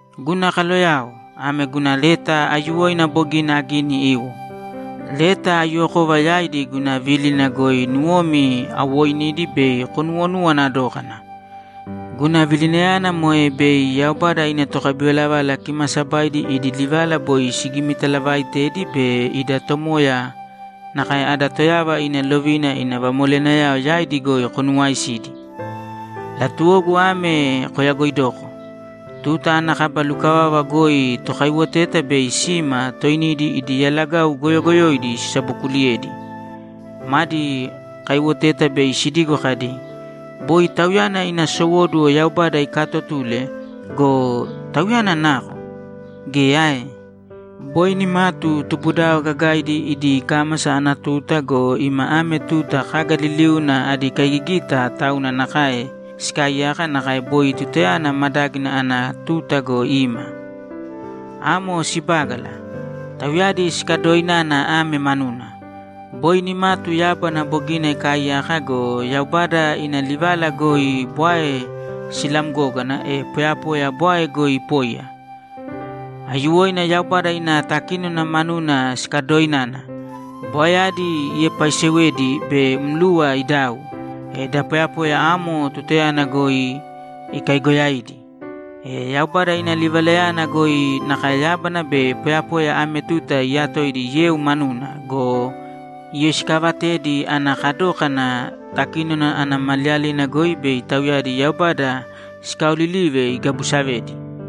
Guna kaloyao, ame guna leta aiyuwoina bogina agini iwo. Leta aiyuwokova yaidi guna vílina goi nuwomi awooinidi bei konuwonuwana dókana. Guna vilinayana moe bei Yaubada ina tokabivalavala kimaasabaidi idi livala boi sigimitalavaaitedi be ida Tomoya nakae ada Toyava ina lovina ina vamoleyanayao yaidi goi konuwaaisidi. Latuwogu ame koyagoidoko: Tuta ana kaba lukavava goi tokaiwoteta bei sima toinidi idi yalagau goyogoyoidi sisabokuliyedi. Madi kaiwoteta bei sidigo kadi, ‘Boi Tauyana ina sowóduwo Yaubada ikaatotule go, Tauyana nako? Geya ae? Boi nimatu tubudao gagaidi idi kámasa ana tuta go, ima ame tuta kaga liliuna adi kaigigita tauna nakae sikaaiyaka nakae boi tutayana madágina ana tuta go, ima.’ Amo sibágala. Tauyadi sikadoinana ame manuna: Boi nimatu yábana bogina ikaaiyaka go, Yaubada ina livala goi bwae silamgógana, e poyapoya bwae goi ipóiya. Aiyuwoina Yaubada ina takínona manuna sikadoinana. Bwaeyadi iepaisewedi be mluwa idau, e da poyapoya amo tutayana goi ikaigoyaidi. E Yaubada ina livalayana goi nakae yábana be poyapoya ame tuta iyatoidi yeu manuna go, iyoisikaavatedi ana kadókana takínona ana maliyalina goi bei tauyadi Yaubada sikaaolilive igabusavedi.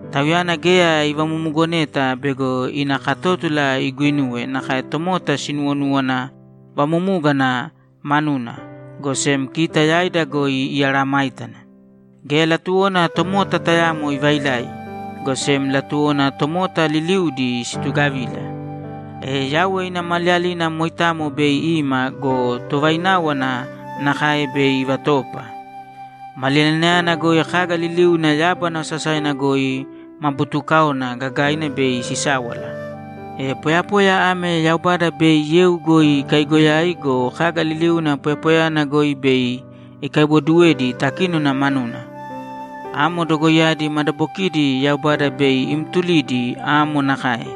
Tauyana geya ivamumugoneta bego ina katótula iguinuwe nakae tomota sinuwonúwana vamumúgana manuna, go sem kita yaida goi imeesayágana. Geya latuwona tomota tayamo ivailai, go sem latuwona tomota liliudi situgavila. E Yauwe ina Maliyalina moitamo bei ima go, tovaináwana nakae bei ivatoopa. Maliyalinayana goi kaga liliuna yábana osasaina goi ma buutukáona gagaina bei sisáwala. E poyapoya ame Yaubada bei yeu goi ikaigoyai go, kaga liliuna poyapoyayana goi bei ikaiwoduwedi takínona manuna. Amo dogoiyadi madabokidi Yaubada bei imtulidi amo nakae,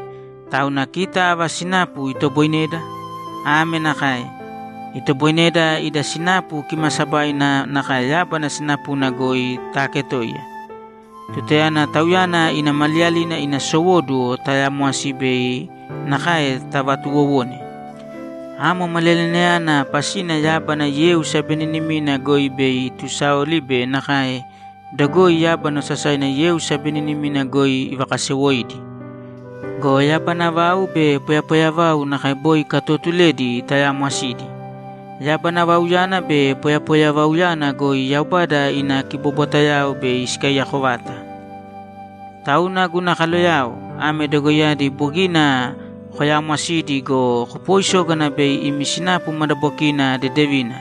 tauna kita ava sinapu itoboineda? Ame nakae: Itoboineda ida sinapu kimaasabaina nakae yábana sinapuna goi taaketoiya tutayana Tauyana ina Maliyalina ina sowóduwo taayamwasi be nakae tavatuuwowone. Amo Maliyalinayana pasina yábana yeu sabeninimina goi bei itusaoli be nakae dogoi yábana osasaina yeu sabeninimina goi ivakasewoidi. Go yabana vau be poyapoya vau nakae boi ikatootuledi tayaamwasidi. Yabana vauyana be poyapoya vauyana goi Yaubada ina kibobwatayao bei sikaiyako vata. Tauna, guna kaloyao, ame dogoiyadi bogina koyaamwasidi go, kopooisōgana bei imi sinapu madabokina dedevina,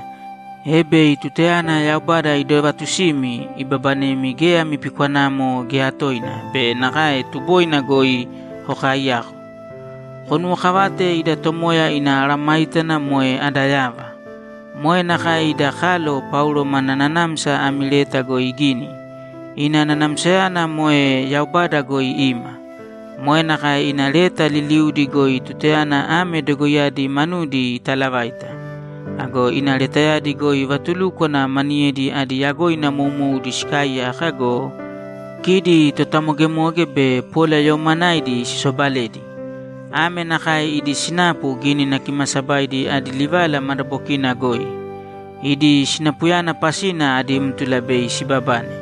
e bei tutayana Yaubada idovatusimi, ibabanemi geya ami pikwanamo geya toina be nakae tuboina goi kokaaiyako. Konuwokavāte ida Tomoya ina mesayágana moe ada yava. Moe nakae ida kalo Paulo mana nanamsa ami leta goi igini. Ina nanamsayana moe Yaubada goi ima. Moe nakae ina leta liliudi goi tutayana ame dogoiyadi manudi italavaita. Ago ina letayadi goi vatulúkwana maniyedi adi yagoina moumoudi sikaaiyaka go, kidi totamogemoge be polayoomanaidi sisobaledi. Ame nakae idi sinapu Gínina Kimaasabaidi adi livala madabokina goi. Idi sinapuyana pasina adí mtula bei sibabane.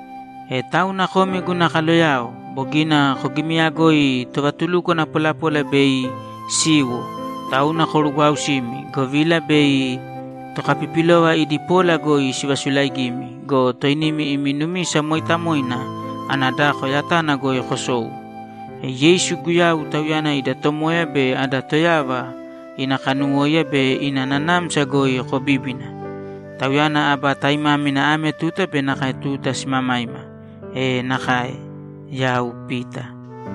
E tauna komi guna kaloyao, bogina kogimiyagoi tovatulukwana polapola bei siwo, tauna korugwaausīmi, govila bei tokapipilova idi pola goi sivasulaigimi go, toinimi imi numisa mooitamoina ana dako yatana goi kosou. E Yeisu Guyau, Tauyana ida Tomoya be ada Toyava, ina kanuwóiya be ina nanamsa goi kobībina. Tauyana aba taimámina ame tuta be nakae tuta simamaima! E nakae! Yau Pita